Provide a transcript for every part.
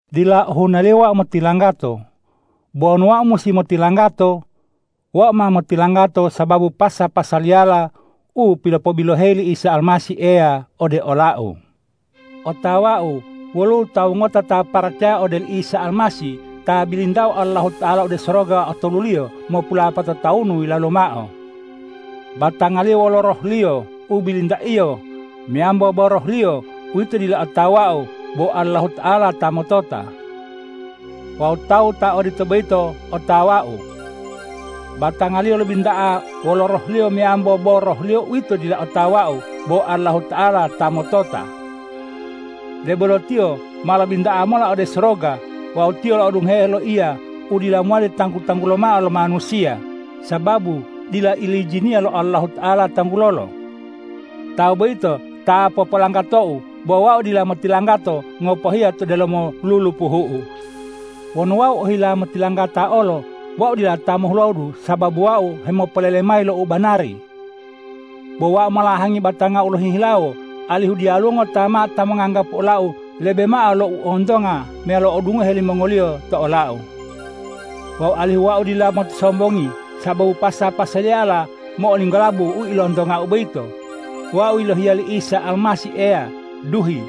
Dila ohunaliyo wau motilanggato. Bo wonu wau musi motilanggato, wau ma motilanggato sababu pasa-pasaliyala u pilopobiloheyi li Isa Almasih Eya ode olau. Otawau woluwo tawu ngota ta paracaya ode oli Isa Almasih ta bilintao Allahuta'ala ode soroga otoluliyo, mopulapato tawunu yilalu mao. Batangaliyo wolo rohliyo u bilintaiyo meyambo bo rohliyo uwito dila otawau bo Allahuta'ala ta motota. Wawu tawu ta odito boyito otawau. Batangaliyo lobinta'a wolo rohliyo meyambo bo rohliyo uwito dila otawau bo Allahuta'ala ta motota. Debolo tiyo ma lobinta'a mola ode soroga wawu tiyo lo'odungohe loiya u dila mowali tanggu-tanggulo mao lo manusiya, sababu dila ilijiniya lo Allahuta'ala tanggulolo. Tawu boyito ta popolanggatou bo wau dila motilanggato ngopohiya to delomo lulupuhu'u. Wonu wau ohila motilanggata olo, wau dila ta mohulodu sababu wau hemopolele mayi lo u banari. Bo wau molahangi batangau lohihilawo, alihu diyaluwo ngota mao ta monganggapu olau lebe mao lo u ontonga meyalo u odungohe limongoliyo to olau. Wawu alihu wau dila motisombongi sababu pasa-pasaliyala mo'olinggolabu u ilontongau boyito, wau yilohiya li Isa Almasih Eya duhi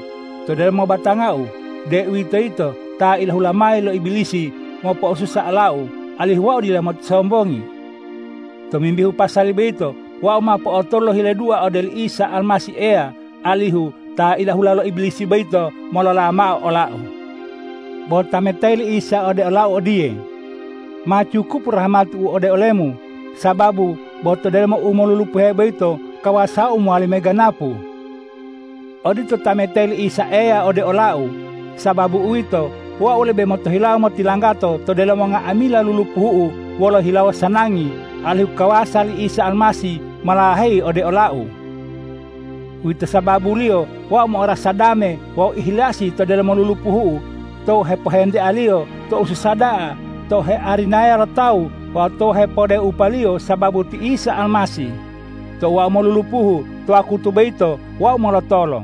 to delomo batangau, deuwitoyito ta ilahula mayi lo Ibilisi mopo'osusa olau, alihu wau dila motisombongi. Tomimbihu pasali boyito wau ma po'otolu lohile dua ode oli Isa Almasih Eya, alihu ta ilahula lo Ibilisi boyito molola mao olau. Bo tametayi li Isa ode olau odiye,”Ma cukupu rahmati-U ode olemu, sababu bo to delomo u molulupuhe boyito kawasa-U mowali meganapu.” Odito tametayi li Isa Eya ode olau. Sababu uwito, wau lebe motohilawo motilanggato to delomo nga'amila lulupuhu'u wolo hilawo sanangi, alihu kawasa li Isa Almasih molaheyi ode olau. Uwito sababuliyo wau mo'orasa dame wawu ihilasi to delomo lulupuhu'u, tou hepohentealiyo, tou susa da'a, tou hearinaya lo tawu wawu tou hepodupealiyo sababu ti Isa Almasih. Tou wau molulupuhu, to wakutu boyito wau molotolo.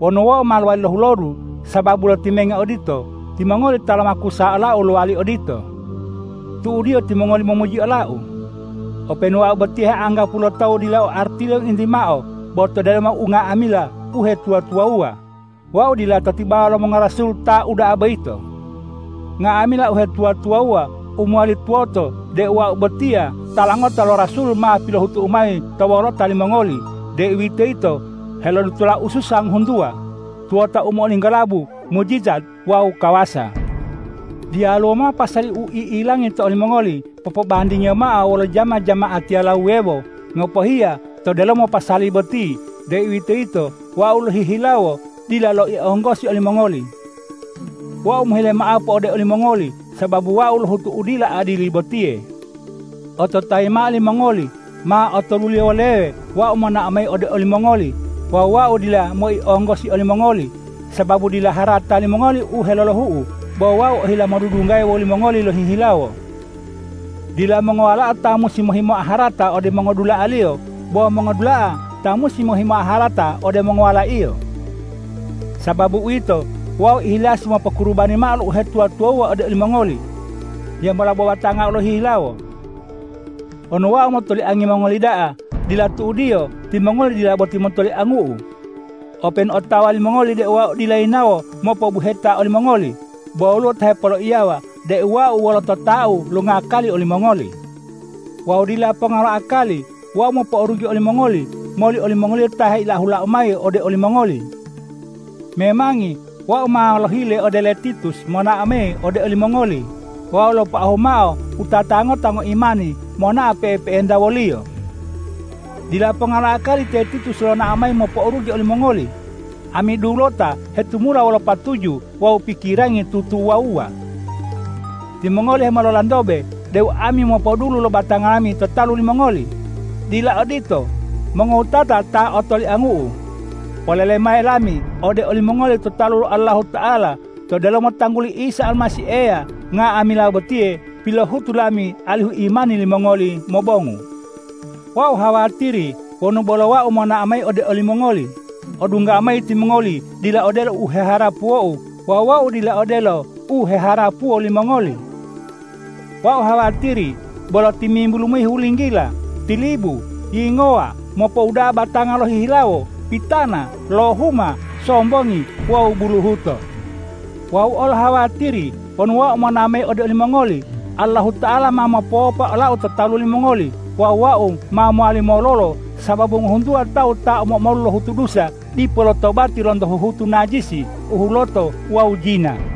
Wonu wau ma lowali lohulodu sababu lotimenge odito, timongoli ta lomakusa olau lowali odito. Tu'udiyo timongoli momuji olau. Openu wau botiya heanggapuwo lo tawu dila o artiliyo ngointi mao, bo to delomo unga'amila uhetuwa-tuwawuwa, wau dila to tibawa lo mongorasul ta uda'a boyito. Nga'amila uhetuwa-tuwawuwa u mowali tuwoto deu wau botiya tala ngota lo rasul ma pilohutu'u mayi to wolota limongoli, deuwitoyito helodutola ususa ngohuntuwa, tuwota u mo'olinggolabu, mujijat wawu kawasa. Diyaluwo mao pasali u i'ilangi to olimongoli popobandingiyo mao wolo jama-jama'atiyala wuwewo ngopohiya to delomo pasali boti, deuwitoyito wau lohihilawo dila loionggosi olimongoli. Wau mohile ma'apu ode olimongoli sababu wau lohutu u dila adili botiye. Ototayi mao limongoli, ma otoluliyo woleye wau monao mayi ode olimongoli wawu wau dila moionggosi olimongoli, sababu dila harata limongoli u helolohu'u, bo wau ohila modudunggaya wolimongoli lohihilawo. Dila mongowalao ta musi mohimoa harata ode mongodula'aliyo, bo mongo'odula'a ta musi mohimoa harata ode mongowalaiyo. Sababu uwito, wau ihilasi mopokurubani mao lo uhetuwa-tuwawuwa ode olimongoli. Hiyambola bo batangau lohihilawo. Wonu wau motoliangi mongoli da'a, dila tu'udiyo timongoli dila boti motoliangu'u. Openu otawa limongoli deu wau dila yinawo mopo'obuheta olimongoli, bo woluwo ta hepoloiyawa deu wau wolo totau longakali olimongoli. Wawu dila ponga lo akali wau mopo'orugi olimongoli moli olimongoliyo ta heilahulau mayi ode olimongoli. Memangi wau ma lohile ode ole Titus monao mayi ode olimongoli wawu lopoahu mao wutata ngota ngoimani monao pe'epe'enta woliyo. Dila ponga lo akali te Titus lonao mayi mopo'orugi olimongoli. Ami dulota hetumula wolo patuju wawu pikirangi tutuwawuwa. Timongoli hemololantobe deu ami mopodulu lo batanga lami to talu limongoli. Dila odito. Mongowutata ta otoliangu'u, polele mayi lami ode olimongoli to talu lo Allahuta'ala to delomo tangguli Isa Almasih Eya: Nga'amila botiye pilohutu lami alihu imani limongoli mobongu. Wau hawatiri wonu bolo wau monao mayi ode olimongoli, odunggau mayi timongoli dila odelo u heharapuwou wawu wau dila odelo u heharapuwo limongoli. Wau hawatiri bolo timimbulu hulinggila, tilibu, yingowa, mopouda'a batanga lohihilawo, pitana, lohuma, sombongi wawu buluhuto. Wau olo hawatiri wonu wau monao mayi ode olimongoli, Allahuta'ala ma mopowopa olau to talu limongoli wawu wau ma mowali mololo sababu ngohuntuwa tawu ta omo-omolu lohutu dusa dipo lotobati lonto huhutu najisi, u huloto wawu jina.